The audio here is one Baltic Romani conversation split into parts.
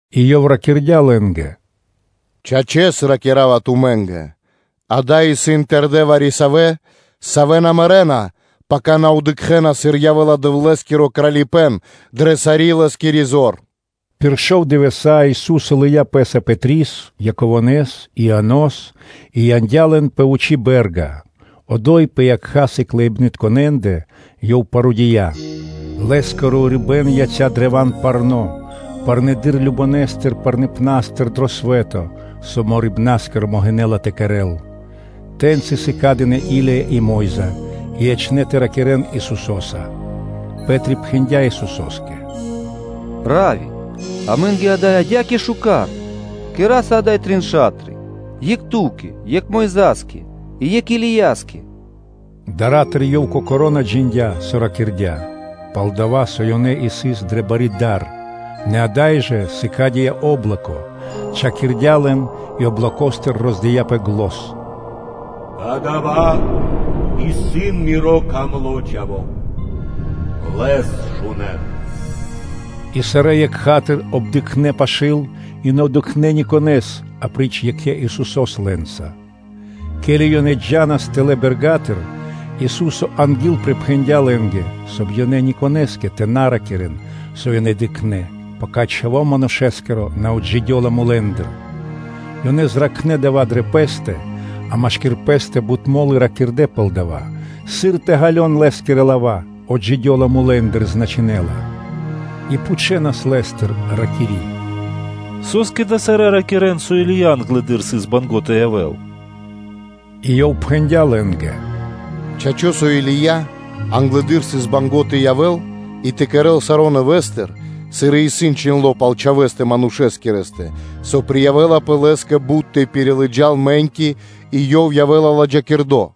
И Ёв ракирдя́ лэ́нгэ: “Чачэс, Мэ ракира́ва тумэ́нгэ: ада́й исын тэрдэ́ вари-савэ́, савэ́ на мэрэ́на, пака ёнэ дыкхэ́на, сыр явэ́ла Дэвлэ́скиро Кралипэ́н дрэ сари́ Лэ́скири зор.” Пир шов дывэса́ Ису́со лыя́ Пэ́са Пэтрис, Яково́с и Ианос и яндя́ лэн пэ вучи́ бэ́рга. Одо́й пэ якха́ сыкляибнытконэндэ Ёв парудыя: Лэ́скиро урибэ́н яця́ древа́н парно́, парнэдыр кажнонэ́ парныпнастыр дро свэ́то, со морибнаскиро (сукновало) могинэ́ла тэ кэрэ́л. Тэ́ньци сыкадынэ Или́я и Мо́йза, и ячнэ́ тэ ракирэ́н Исусо́са. Пэ́три пхэндя́ Исусо́скэ: “Равви, амэ́нгэ ада́й исын адя́кэ шука́р! Кэра́са ада́й трин ша́тры: екх Ту́кэ, екх Мойза́скэ и екх Илияскэ.” Дара́тыр ёв кокоро́ на джиндя́, со ракирдя́, пал-дова́ со ёнэ сыс дрэ бари дар. Нэ ада́й жа сыкадыя́ о́блоко, чхакирдя лэн и облокостыр роздыяпэ зан!: “Кадава́ исын Миро дро́го Чхаво́, Лэс шунэ́н!” И сарэ́ екха́тыр обдыкхнэ пашы́л и на дыкхнэ́ никонэ́с, апри́ч екхэ Исусо́стэ лэ́нца. Ке́ли ёнэ джа́нас тэлэ́ бэрга́тыр, Ису́со ангилприпхэндя лэ́нгэ, соб (кай) ёнэ ни конэ́скэ тэ на ракирэ́н, со ёнэ дыкхнэ́, пака Чхаво́ Манушэ́скиро на отджидёла мулэ́ндыр. Ёнэ ракхнэ дава́ дрэ пэ́стэ, а машки́р пэ́стэ бут мо́лы ракирдэ́ пал дава́, сыр тэ ґалён Лэ́скирэ лава́ ‘отджидёла мулэ́ндыр’. И пхучэнас Лэ́стыр, ракири́: “Со́скэ ж лылвари́тка (кни́жники) ракирэ́на, со Или́я англэды́р сыс банго́ (мусиндя) тэ явэ́л?” И Ёв отпхэндя́ лэ́нгэ: “Чачо́, со Или́я англэды́р сыс банго́ тэ явэ́л и тэ кэрэ́л саро́ нэвэ́стыр, сыр и исын чхиндло́ пал Чхавэ́стэ Манушэскирэстэ, со приявэлапэ Лэ́скэ бут тэ пирилыджал мэ́ньки, и со Ёв явэ́ла ладжакирдо́?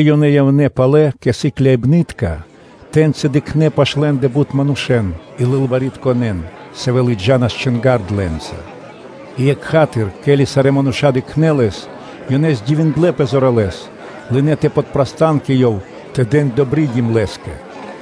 Ке́ли ёнэ явнэ́ палэ кэ сыкляибны́тка, тэ́ньчи дыкхнэ́ пашы́л лэ́ндэ бут манушэ́н и лылваритконэн, савэ́ допхэнэнас лэ́нгэ. И екха́тыр (сра́зу), ке́ли сарэ́ мануша́ дыкхнэ́ Лэс, ёнэ дивиндлэ́пэ зоралэ́с, лынэ́ тэ подпрастан кэ Ёв тэ дэн “добридим” Лэ́скэ.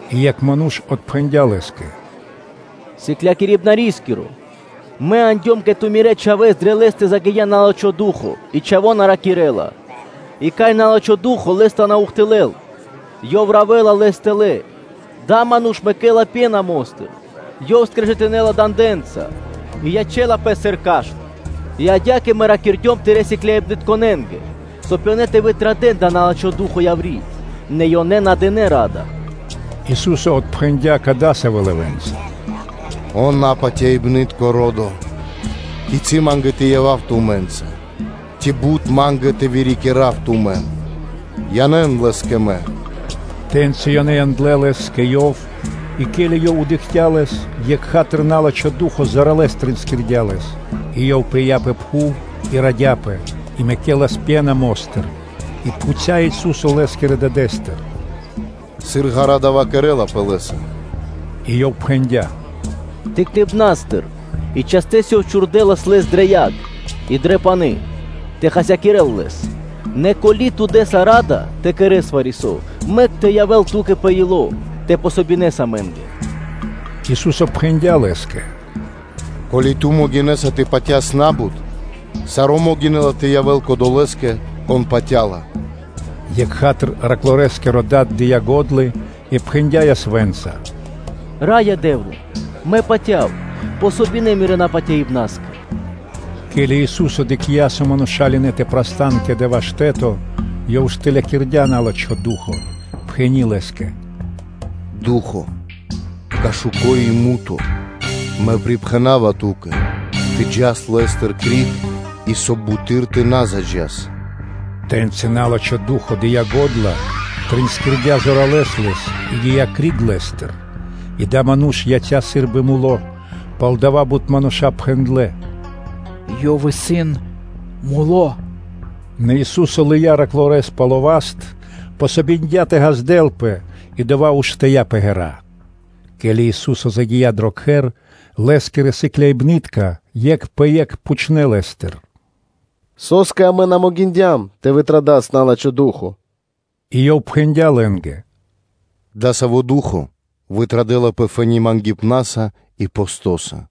И екх ману́ш отпхэндя́ Лэ́скэ: “Сыклякирибнарискиро, мэ яндём кэ Ту мирэ́ чхавэ́с, дрэ лэ́стэ загия́ на́лачхо ду́хо (фа́но) и чхаво́ на ракирэ́ла. И кай на́лачхо ду́хо (фа́но) лэс тэ на ухтылэл, то ёв равэла лэс тэлэ́, адава́ ману́ш мэкэ́ла пена мо́стыр, ёв скрежытынэла дандэнца и ячэ́лапэ сыр кашт. И адя́кэ мэ ракирдём Тырэ́ сыкляибнытконэ́нгэ, соб (кай) ёнэ тэ вытрадэн дава́ на́лачхо ду́хо (фа́но) яври́, нэ ёнэ на дынэ́ ра́да. Ису́со отпхэндя́ кадасавэ́ лавэ́нца: “О, напатяибнытко ро́до! Кицы́ Ма́нгэ тэ явав тумэ́нца? Ци бут Ма́нгэ тэ вырикирав тумэн? Янэ́н лэс кэ Мэ!” Тэ́ньци ёнэ яндлэ́ лэс кэ Ёв. И ке́ли ёв дыкхця́ Лэс, екха́тыр на́лачхо ду́хо (фа́но) зоралэ́с тринскирдя лэс, и ёв пыя́ пэ пхув и радяпэ, и мэкэлас пена мо́стыр. И пхуця́ Ису́со лэ́скирэ дадэ́стыр: “Сыр ґара́ (длу́гэс) дава́ кэрэ́лапэ лэ́са?” И ёв пхэндя́: “Тыкныбнастыр. И частэс ду́хо чхурдэлас лэс дрэ яг и дро пани́ тэ хасякирэ́л лэс. Нэ ко́ли ту дэ́са ра́да тэ кэрэ́с вари-со, мэк тэ явэ́л ту́кэ пэ ило́ тэ дэс васт амэ́нгэ.” О Ису́со пхэндя́ Лэ́скэ: “Ко́ли ту могинэ́са тэ патяс на́бут, саро́ могинэ́ла тэ явэ́л кодолэ́скэ, кон патя́ла. Екха́тыр (сра́зу) тэрнэ́-бэршэнгиро дад дыя́ го́дла и пхэндя́ ясвэ́нца: “Раё Дэ́вла! Мэ патя́ва, помогин Мирэ́ напатяибнаскэ!” Ке́ли Ису́со дыкхця́, со мануша́ лынэ́ тэ прастан кэ дава́ штэ́то, ёв штылякирдя на́лачхо ду́хо (фа́но), пхэни́ лэ́скэ: “Ду́хо (Фа́но) кашуко и муто (немо), мэ припхэнава ту́кэ, тэ джас криг лэ́стыр, и, соб (кай) буты́р тэ на заджас!” Тэ́ньци на́лачхо ду́хо (фа́но) дыя́ го́дла, тринскирдя зоралэ́с лэс и гия́ криг лэ́стыр. И адава́ ману́ш яця́ сы́рбы муло́, палдава́ бут мануша́ пхэндлэ́: “Ёв исын муло́.” Нэ Ису́со лыя́ тэрнэ́-бэршэнгирэс пало́ васт, помогиндя (дыя́ васт) тэ ґаздэлпэ и одова́ уштыя́ пэ ґэра́. Ке́ли Ису́со загия́ дро кхэр, Лэ́скирэ сыкляибны́тка екх пэ екх пхучнэ́ Лэ́стыр: “Со́скэ амэ на могиндям тэ вытрадас на́лачхо ду́хо (фа́но)?” И Ёв пхэндя́ лэ́нгэ: “Дасаво ду́хо (фа́но) вытрадэлапэ фэ́ни (то́ка) мангипнаса и постоса.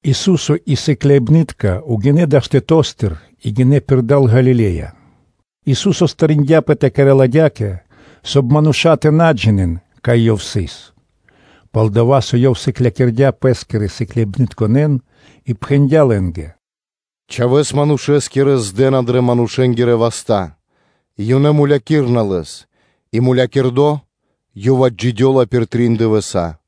Ису́со и сыкляибны́тка гинэ́ пэ́скэ далэ́ штэто́стыр и гинэ́ пирда́л Галиле́я. Ису́со причхудя зор тэ кэрэ́л адя́кэ, соб (кай) мануша́ тэ на джинэ́н, кай Ёв сыс. Пал-дова́ со Ёв сыклякирдя́ Пэ́скирэ сыкляибнытконэ́н, и пхэндя́ лэ́нгэ: “Чхавэ́с Манушэскирэс здэна дрэ манушэ́нгирэ васта́, и ёнэ мулякирэна Лэс; и мулякирдо Ёв отджидёла пир трин дывэса́.”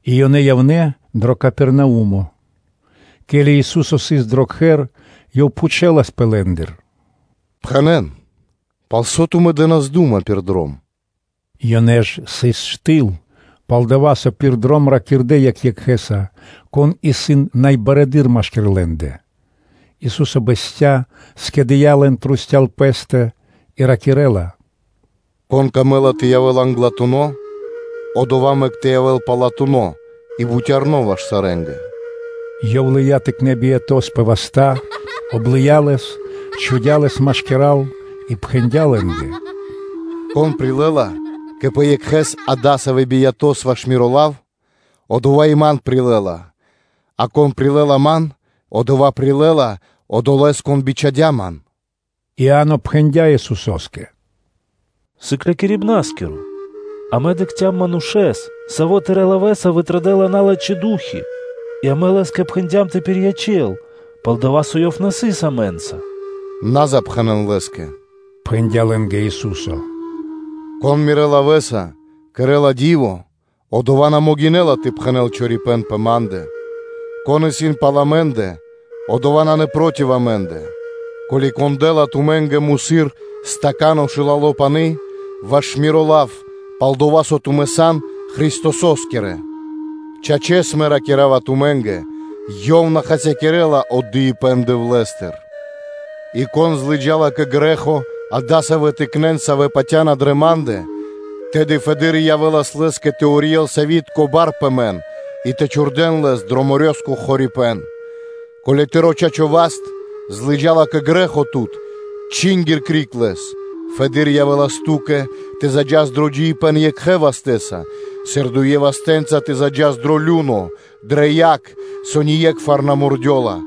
И ёнэ явнэ́ дро Капернаумо. Ке́ли Ису́со сыс дро кхэр, Ёв пхучэласпэ лэ́ндыр: “Пхэнэ́н, пал со тумэ́ дэ́нас дума пир дром?” Ёнэ ж сыс штыл; пал-дова́ со пир дром ракирдэ́ екх екхэ́са, кон исын най барэды́р машки́р лэ́ндэ? Ису́со бэсця́, скэдыя́ лэн трусця́л (вокруг) Пэ́стэ и ракирэ́ла: “Кон выкэдэ́ла тэ явэ́л англатуно́, одова́ мэк тэ явэ́л палатуно́ и бутярно ваш сарэ́нгэ.” Ёв лыя́ тыкнэ́ биято́с (чхаворэс) пэ васта́, облыя лэс, чхудя́ лэс машкира́л и пхэндя́ лэ́нгэ: “Кон прилэ́ла кэ пэ екхэ́с адасавэ́ биято́с ваш Миро лав, одова́ и Ман прилэ́ла, а кон прилэ́ла Ман, одова́ прилэ́ла Одолэ́с, Кон бичхадя́ Ман?” Иа́но пхэндя́ Исусо́скэ: “Сыклякирибна́скиро! Амэ дыкхцям манушэ́с, саво́ Тырэ́ лавэ́са вытрадэла налачхэ́ ду́хи (фаны) и амэ лэ́скэ пхэндям тэ пириячэл, пал-дова́ со ёв на сыс амэ́нца.” “На запхэнэн Лэ́скэ, – пхэндя́ лэ́нгэ Ису́со, – кон Мирэ́ лавэ́са кэрэ́ла ди́во, одова́ на могинэ́ла тэ пхэнэ́л чорипэ́н пэ Ма́ндэ. Кон исын пал амэ́ндэ, одова́ нанэ проти амэ́ндэ. Ко́ли вари-кон дэ́ла тумэ́нгэ тахта́й (чаша) шылалэ пане́са, ваш Миро лав, пал-дова́ со тумэ́ сан Христосо́скирэ, чачэс Мэ ракира́ва тумэ́нгэ: ёв на хасякирэ́ла отдыибэ́н Дэвлэ́стыр. И кон злыджала кэ грэ́хо адасавэн тыкнэн, савэ́ патя́на дрэ Ма́ндэ, тэды фэды́р явэ́лас лэ́скэ тэ урьел сявитко (мельнично) бар пэ мэн и тэ чхурдэ́н лэс дро морёскиро (дэрьявэ́скиро) хорипэ́н. Ко́ли тыро́ чачо́ васт злыджала кэ грэ́хо тут, чингир криг лэс. Фэды́р явэ́лас ту́кэ тэ заджас дро джиибэ́н екхэ вастэ́са, сыр дуе вастэ́нца тэ заджас дро лю́но (адо), дрэ яг, со ние́кхвар на мурдёла.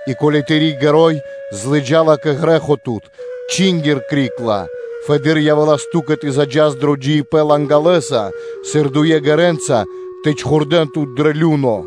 И ко́ли тыри́ ґэро́й злыджала кэ грэ́хо тут, чингир криг ла. Фэды́р явэ́лас ту́кэ тэ заджас дро джиибэ́н лангалэса, сыр дуе ΄гэрэнца тэ чхурдэ́н тут дро лю́но.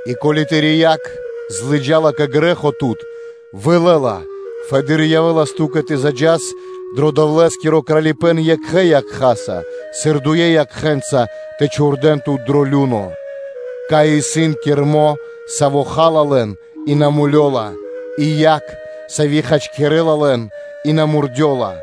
И ко́ли тыри́ якх злыджала кэ грэ́хо тут, вылэ ла. Фэды́р явэ́лас ту́кэ тэ заджас дро Дэвлэ́скиро Кралипэ́н екхэ якхаса, сыр дуё якхэ́нца тэ чхурдэ́н тут дро лю́но, кай исын кирмо, саво́ ха́ла лэн, саво на мулёла, и яг, сави́ хачкирэ́ла лэн, со на мурдёла.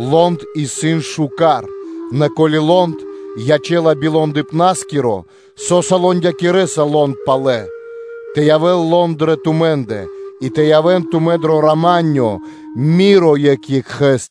Лонд исын куч, нэ ко́ли лонд ячэ́ла би лондыпнаскиро, со́са лондякирэса лонд палэ? Тэ явэ́л лонд дрэ тумэ́ндэ, и тэ явэ́н тумэ́ дро рама́нё (миро) екх екхэ́са!”